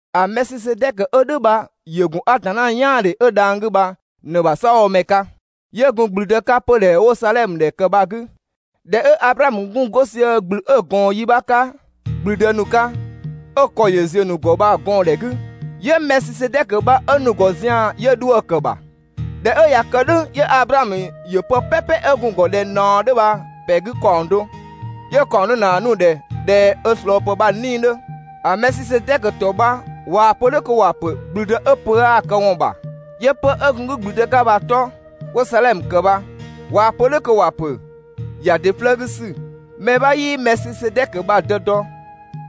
‑A Mɛɛsisedɛkö 'ö "dhʋ̈ bha ‑yö ‑gun Atanna "yaandhe 'ö dhang‑ 'gü bha ꞊në‑ ‑bha "saabhomɛ 'ka, 'yö gun ‑gblüdë 'ka 'pödhɛ 'wo‑ Sadhɛmö ‑dhɛ ‑kë bha‑ 'gü. ꞊Dhɛ 'ö Ablaamö gun 'go sië ‑gblü 'ö‑ ꞊gɔɔn yi 'bha 'ka ‑gblüdë ‑nu 'ka, 'ö‑ ‑kɔ ‑yö ‑ziö ‑nu ‑gɔ bha‑ gɔɔndhɛ 'gü, 'yö Mɛɛsisedɛkö bha 'ö nu‑ ‑gɔ zian‑, 'yö 'dhuë‑ ‑kë ‑bha. ꞊Dhɛ 'ö ꞊ya kë "dhʋ̈ 'yö Ablaamö ‑yö pë "pɛpɛ 'ö gun‑ ‑gɔ ꞊dhɛ ꞊naɔ 'dhö bha‑ ‑pɛ 'gü ‑kaɔng do, 'yö‑ ‑kaɔng do ‑naa nu‑ ‑dhɛ ꞊dhɛ ö ꞊slɔɔpë bha‑ 'nii‑ 'dhö. ‑A Mɛɛsisedɛkö ‑tɔ bha waa‑ pö "dhʋ̈ kö ‑wa ‑pö «‑gblüdë 'ö pö 'aa‑ këwɔn ‑bha», 'yö 'pö‑ 'ö gun‑ 'gü ‑gblüdë 'ka bha‑ 'tɔ 'wo‑ Sadhɛmö ‑kë bha, ꞊waa‑ pö "dhʋ̈ kö ‑wa ‑pö: «‑ya ‑dɩ 'flëë‑ 'gü ‑sü». Mɛ 'bha 'yii‑ Mɛɛsisedɛkö bha‑ dë dɔ,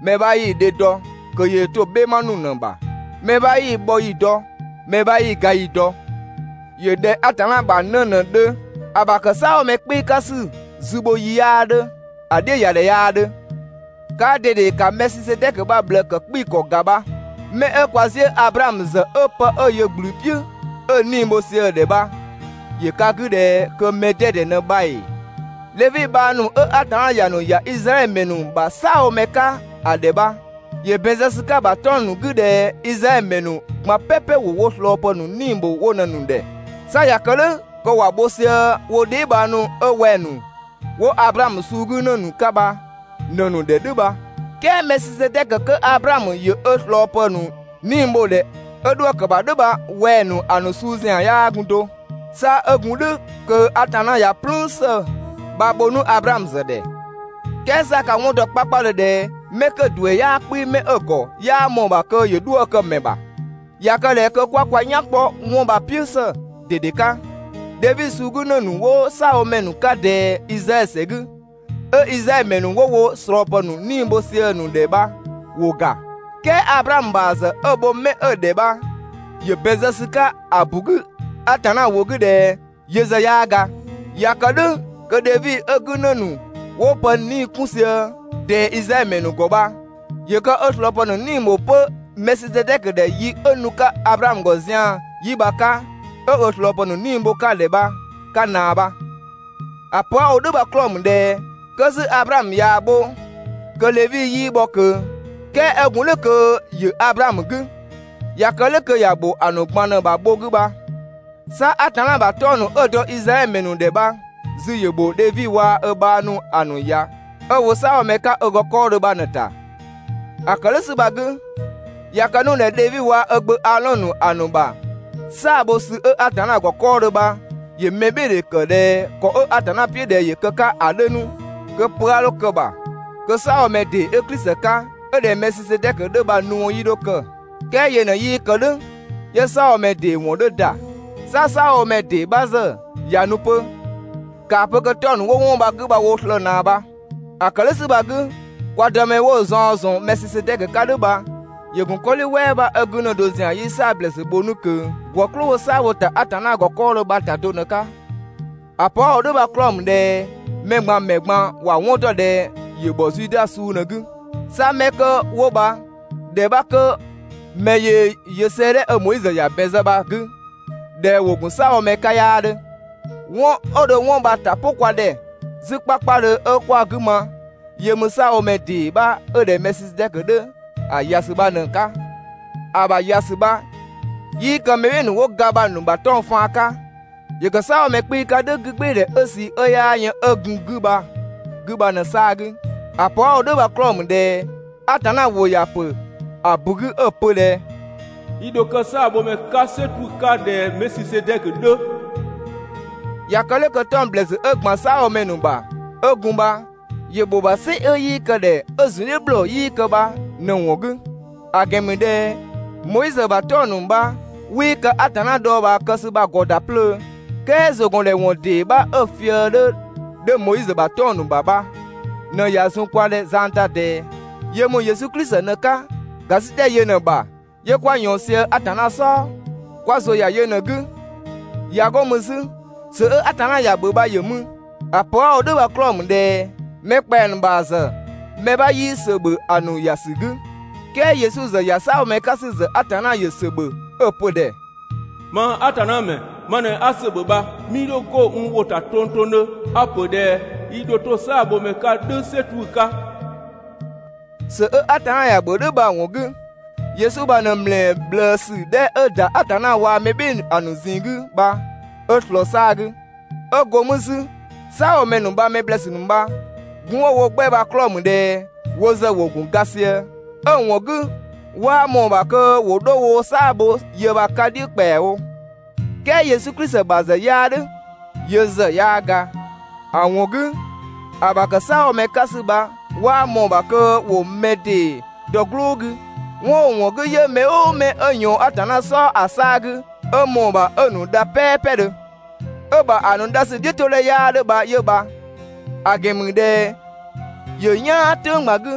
mɛ 'bha 'yii‑ dhe dɔ kö yöö to‑ "bhɛma ‑nu ꞊në‑ bha. Mɛ 'bha 'yii‑ bhɔ ‑yi dɔ, mɛ 'bha 'yii‑ ga ‑yi dɔ. ‑Yö ꞊dhɛ Atanna ‑bha 'në ꞊në‑ 'dhö. ‑A ‑bha ‑kë "saabhomɛ 'kpii‑ 'ka ‑sü zü bho ‑yi 'yaa 'dhö, ‑a "dhiʋ̈ ‑ya ‑dhɛ 'yaa 'dhö. Kaa ꞊dede ‑ka Mɛɛsisedɛkö bha‑ ꞊bhlëë ‑kë 'kpii‑ ‑kɔ ‑ga bha. 'Mɛ 'ö kwa 'ziʋ̈‑ Ablaamö ‑zë 'ö 'pë 'ö ‑yö ‑gblü "piʋ̈ ‑a 'nii‑ bho sië‑ ‑dhɛ bha ‑yö ka 'gü ꞊dhɛ kö mɛ 'dɛdɛ ꞊në bha ‑ee? Dhevi bhang ‑nu 'ö Atanna ‑ya ‑nu ‑ya Izraɛdhö ‑mɛ ‑nu ‑bha "saabhomɛ 'ka ö ‑dhɛ bha, ‑yö ‑bɛn zë ‑sü 'ka‑ ‑bha 'tɔng‑ ‑nu 'gü ꞊dhɛ Izraɛdhö ‑mɛ ‑nu ꞊gban "pɛpɛ ‑wo wo ꞊slɔɔpë ‑nu 'nii‑ bho wo ꞊në‑ ‑nu ‑dhɛ. 'Sa ꞊ya kë "dhʋ̈ kö ‑wa bho sië wo dheebhang ‑nu 'ö wɛng‑ ‑nu 'wo Ablaamö suu 'gü ‑në ‑nu 'ka bha ꞊në‑ ‑nu ‑dhɛ "dhʋ̈ bha. "Kɛɛ Mɛɛsisedɛkö 'kö Ablaamö ‑yö ö ꞊slɔɔ ‑pë ‑nu 'nii‑ bho‑ ‑dhɛ 'ö 'dhuë‑ ‑kë ‑bha "dhʋ̈ bha wɛng‑ ‑nu ‑a ‑nu suu ‑zian 'yaa gun do. 'Sa 'ö gun "dhʋ̈ kö Atanna ꞊ya "plüün ‑së bha‑ bho 'nu Ablaamö ‑zë ‑dhɛ. "Kɛɛ 'sa ka‑ 'wɔn ‑dɔ 'kpakpadhö ꞊dhɛ 'mɛ 'kö‑ ‑duɛ 'yaa 'kpii‑ 'mɛ 'ö‑ ‑gɔ, 'yaa ꞊mɔɔ‑ ‑bha kö ‑yö 'dhuë‑ kë‑ ‑mɛ ‑bha. ꞊Ya kë ꞊dhɛ kö 'kwa kwa "yan kpɔ 'wɔn bha‑ "piʋ̈ ‑së ꞊dede 'ka, Dhevi suu 'gü ‑në ‑nu 'wo "saabhomɛ ‑nu 'ka ꞊dɛɛ Izraɛdhö ‑sɛ 'gü, 'ö Izraɛdhö ‑mɛ ‑nu 'wo wo ꞊slɔɔpë ‑nu 'nii‑ bho sië‑ ‑nu ‑dhɛ bha ‑wo ‑ga. "Kɛɛ Ablaamö ‑bha ‑zë 'ö‑ bho 'mɛ 'ö‑ ‑dhɛ bha ‑yö ‑bɛn zë ‑sü 'ka ‑a ‑bu 'gü Atanna ‑wʋ 'gü ꞊dhɛ yö ‑zë 'yaa ga. ꞊Ya kë "dhʋ̈ kö Dhevi 'ö‑ 'gü ‑në ‑nu 'wo pë 'nii‑ 'kun sië ꞊dɛɛ Izraɛdhö ‑mɛ ‑nu ‑gɔ bha ‑yö kë ö ꞊slɔɔpë ‑nu 'nii‑ ‑bho 'pö Mɛɛsisedɛkö ‑dhɛ yi 'ö nu‑ 'ka Ablaamö ‑gɔ zian‑ yi 'bha 'ka 'ö ö ꞊slɔɔpë ‑nu 'nii‑ bho‑ 'ka‑ ‑dhɛ bha‑ 'ka ꞊naa bha. ‑A pö 'a‑ wo "dhʋ̈ bha‑ 'klɔɔ‑ ‑mü ꞊dhɛ 'kö 'zü Ablaamö ꞊yaa‑ bho kö Dhevi 'yii bhɔ ꞊kö, "kɛɛ 'ö gun "dhʋ̈ kö ‑yö Ablaamö 'gü. ꞊Ya kë "dhʋ̈ kö ‑ya ‑bho ‑a ‑nu ꞊gban ꞊në‑ ‑bha bho 'gü bha. 'Sa Atanna ‑bha 'tɔng‑ ‑nu 'ö‑ dɔ Izraɛdhö ‑mɛ ‑nu ‑dhɛ bha‑ zü ‑yö ‑bho Dhevi waa‑ ö bhang ‑nu ‑a ‑nu ‑ya 'ö‑ wo "saabhomɛ 'ka ö ‑gɔ 'kɔɔ dho bha ꞊në‑ ‑ta. ‑A ‑kë "dhʋ̈ ‑sü bha‑ 'gü, ꞊ya kë 'nu ꞊dhɛ Dhevi waa‑ ö gbö Aadhɔn ‑nu ‑a ‑nu ‑bha "saa‑ bho ‑sü 'ö Atanna ‑gɔ 'kɔɔdhö bha ‑yö mɛbhɩɩdhe ‑kë ꞊dhɛ ‑kɔ 'ö Atanna "piʋ̈ ꞊dhɛ ‑yö kë‑ 'ka ‑a 'dhö 'nu, kö pö 'a 'dho kë‑ ‑bha, kö "saabhomɛ ‑dee 'ö (Klisi) 'ka 'ö ꞊dhɛ Mɛɛsisedɛkö 'dhö bha‑ nu ‑wɔn 'yii 'dho kë. "Kɛɛ yö ꞊në 'yii kë "dhʋ̈ 'yö "saabhomɛ ‑dee ‑wɔn 'dhö ‑da. 'Sa "saabhomɛ ‑dee 'bha ‑zë ꞊ya nu 'pö, ‑kaa pö kö 'tɔng‑ ‑nu 'wo 'wɔn bha‑ 'gü bha woo slëë‑ ꞊naa bha. ‑A ‑kë "dhʋ̈ ‑sü bha‑ 'gü, kwa Dëmɛ 'wo‑ zaɔn ‑zɔn Mɛɛsisedɛkö 'ka "dhʋ̈ bha ‑yö ‑gun 'kɔdhi "wɛɛ 'bha 'ö 'gü ‑në do ‑zian 'yii "saa‑ ‑blɛɛsü bho 'nu ꞊kö ‑gwë "klʋ 'wo "saa‑ bho‑ ‑ta Atanna ‑gɔ 'kɔɔdhö bha‑ ‑ta do ꞊në‑ 'ka. ‑A pö 'a‑ wo "dhʋ̈ bha‑ 'klɔɔ‑ ‑mü ꞊dhɛ mɛ ꞊gban ‑mɛ ꞊gban ‑wa 'wɔn dɔ ꞊dhɛ ‑yö ‑bhɔ Zuda suu ꞊në‑ 'gü. 'Sa 'mɛ 'kö 'wo bha ‑dhɛ 'bha 'kö mɛ yöö‑ yö 'sëëdhɛ 'ö Moizö ‑ya ‑bɛn zë bha‑ 'gü ꞊dhɛ ‑wo ‑gun "saabhomɛ 'ka 'yaa 'dhö. 'Wɔn 'ö dho 'wɔn bha‑ ‑ta "pʋ kwa ‑dhɛ 'zü 'kpakpadhö 'ö 'kwa‑ 'gü ma 'yö ‑mü "saabhomɛ ‑dee 'bha 'ö ꞊dhɛ Mɛɛsisedɛkö 'dhö ‑a ‑ya ‑sü bha ꞊në‑ 'ka. ‑A ‑bha ‑ya ‑sü bha 'yii kë mɛ "bhɩɩ‑ ‑nu 'wo ga bha‑ ‑nu ‑bha 'tɔng‑ faan 'ka, ‑yö ‑kë "saabhomɛ 'kpii‑ 'ka "dhʋ̈ 'gügbɩɩdhɛ 'ö ꞊sii 'ö 'yaa yën 'ö gun‑ 'gü bha‑ 'gü bha ꞊në‑ 'saa‑ 'gü. ‑A pö 'a‑ wo "dhʋ̈ bha‑ 'klɔɔ‑ ‑mü ꞊dhɛ Atanna ‑wʋ ‑ya ‑pö ‑a ‑bu 'gü 'ö‑ pö ꞊dhɛ: «I ‑dho kë "saabhomɛ 'ka "sɛ 'tuʋ̈‑ 'ka ꞊dhɛ Mɛɛsisedɛkö 'dhö.» ꞊Ya kë "dhʋ̈ kö 'tɔng‑ ‑blɛɛsü 'ö ‑gban "saabhomɛ ‑nu ‑bha 'ö gun bha ‑yö ‑bho ‑bha "sɩ 'ö 'yii kë‑ ‑dhɛ, 'ö‑ ‑zun "dhiʋ̈ ‑bhlɔɔ 'yii kë bha ꞊në‑ ‑wɔn 'gü. ‑A ‑gɛn ‑mü ꞊dhɛ Moizö ‑bha 'tɔng‑ ‑nu bha 'wii ka Atanna dhɔɔbhaa kë ‑sü bha‑ ‑gɔ ‑da 'plöö. "Kɛɛ ‑zʋgɔndhɛwɔn ‑dee 'bha 'ö‑ fië‑ 'dhö 'dhö Moizö ‑bha 'tɔng‑ ‑nu ‑bha bha ꞊në ꞊ya zun kwa ‑dhɛ zang ‑ta ꞊dɛɛ. Yö ‑mü Yesu Klisi ꞊në‑ 'ka. ‑Gasitɛ yö ꞊në‑ ‑bha 'yö 'kwa ꞊yɔɔn sië Atanna "sɔɔ, kwa ‑zʋ ‑ya yö ꞊në‑ 'gü. ꞊Ya 'go mü 'zü, ‑sö 'ö Atanna ‑ya ‑bhö bha ‑yö mü. ‑A pö 'a‑ wo "dhʋ̈ bha‑ 'klɔɔ‑ ‑mü ꞊dhɛ mɛ ‑kpɛa ‑nu ‑bha ‑zë mɛ 'bha 'yii ‑sö ‑bhö ‑a ‑nu ‑ya ‑sü 'gü. "Kɛɛ Yesu ‑zë ‑ya "saabhomɛ 'ka ‑sü ‑zë Atanna ‑yö ‑sö ‑bhö 'ö‑ pö‑ ‑dhɛ: «Mang Atanna ‑mɛ ma ꞊në 'a ‑sö ‑bhö bha, 'mii 'dho 'go n ‑wʋ ‑ta tongtongdhö. A‑ ‑pö ꞊dhɛ i ‑dho 'to "saabhomɛ 'ka "dhʋ̈ "sɛ 'tuʋ̈‑ 'ka.» ‑Sö 'ö Atanna ‑ya ‑bhö "dhʋ̈ bha‑ ‑wɔn 'gü, Yesu bha ꞊në ‑mlɛɛ ꞊bhlëësü 'dhɛ 'ö ‑da Atanna waa‑ mɛ "bhɩɩ‑ ‑nu ‑a ‑nu ꞊zinng 'gü bha 'ö ꞊slɔɔ‑ 'saa‑ 'gü. 'Ö go mü 'zü, "saabhomɛ ‑nu bha‑ mɛ ‑blɛɛsü ‑nu bha, gun 'wo‑ wo 'gbɛ bha‑ 'klɔɔ‑ ‑mü ꞊dhɛ wo ‑zë ‑wo ‑gun ga sië, 'ö‑ ‑wɔn 'gü 'waa ꞊mɔɔ‑ ‑bha kö ‑wo 'dho woo‑ "saa‑ bho ‑yë bha‑ 'ka "dhiʋ̈ ‑kpɛawo. "Kɛɛ Yesu Klisi ‑bha ‑zë 'yaa "dhʋ̈. Yö ‑zë 'yaa ga, ‑a ‑wɔn 'gü ‑a ‑bha ‑kë "saabhomɛ 'ka ‑sü bha 'waa ꞊mɔɔ‑ ‑bha kö ‑wo mɛ ‑dee dɔ‑ "gblʋʋ 'gü. 'Wɔn 'ö‑ ‑wɔn 'gü, 'yö mɛ "ʋʋ mɛ 'ö ꞊yɔɔn Atanna "sɔɔ ‑a 'saa‑ 'gü 'ö ꞊mɔɔ‑ ‑bha 'ö‑ ‑nu dha "pɛɛpɛdhö, 'ö‑ ‑bha ‑a ‑nu dha ‑sü "dhiʋ̈todhɛ 'yaa 'dhö bha 'yö bha. ‑A ‑gɛn ‑mü ꞊dhɛ ‑yö "yaan "tʋ̈ng ꞊gban 'gü,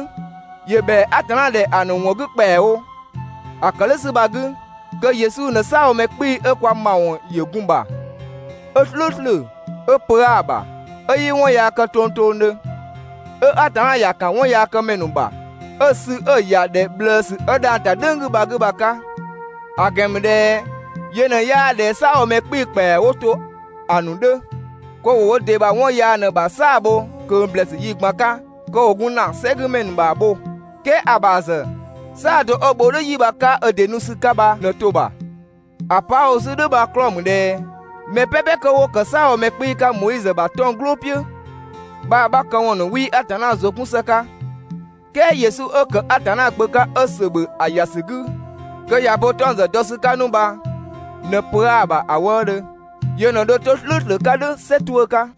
‑yö ‑bhɛa Atanna ‑dhɛ ‑a ‑nu ‑wɔn 'gü ‑kpɛawo. ‑A ‑kë "dhʋ̈ ‑sü bha‑ 'gü, kö Yesu ꞊në "saabhomɛ 'kpii‑ 'ö kwa ‑mawɔn ‑yö gun‑ ‑bha, 'ö "slʋ̈ʋ̈slʋ̈, 'ö pö 'aa‑ ‑bha, 'ö 'yii 'wɔn yaa kë tongtongdhö, 'ö Atanna ‑ya ‑kan 'wɔnyaakëmɛ ‑nu ‑bha, 'ö‑ sü 'ö‑ ‑ya ‑dhɛ ꞊bhlëësü 'ö dhang‑ ‑ta "dhʋ̈ng 'gü bha‑ 'gü bha‑ 'ka. ‑A ‑gɛn ‑mü ꞊dhɛ yö ꞊në 'yaa ꞊dhɛ "saabhomɛ 'kpii‑ ‑kpɛa 'wo to ‑a ‑nu 'dhö kö ‑wo wo ‑dɩ ‑bha 'wɔn yaa ꞊në‑ ‑bha "saa‑ bho ꞊kö ‑blɛɛsü yi ꞊gban 'ka kö ‑wo gun ‑na "sɛgümɛ ‑nu ‑bha bho. "Kɛɛ ‑a ‑bha ‑zë "saa‑ do 'ö‑ bho "dhʋ̈ 'yi bha‑ 'ka ö ‑dɩ nu ‑sü 'ka bha ꞊në to‑ ‑bha. ‑A pö 'a‑ wo 'zü "dhʋ̈ bha‑ 'klɔɔ‑ ‑mü ꞊dhɛ mɛ "pɛpɛ 'kö 'wo ‑kë "saabhomɛ 'kpii‑ 'ka Moizö ‑bha 'tɔng‑ "gblʋʋ "piʋ̈ bha‑ 'bha këwɔn ‑nu 'wii Atanna ‑zʋ 'kun ‑së 'ka, "kɛɛ Yesu 'ö ‑kë Atanna Gbö 'ka, 'ö ‑sö ‑bhö ‑a ‑ya ‑sü 'gü kö ꞊ya bo 'tɔng‑ ‑zë dɔ ‑sü 'ka 'nu bha ꞊në pö 'aa‑ ‑bha ‑a wëëdhö. Yö ꞊në dho 'to "slʋ̈ʋ̈slʋ̈ 'ka "dhʋ̈ "sɛ 'tuʋ̈‑ 'ka.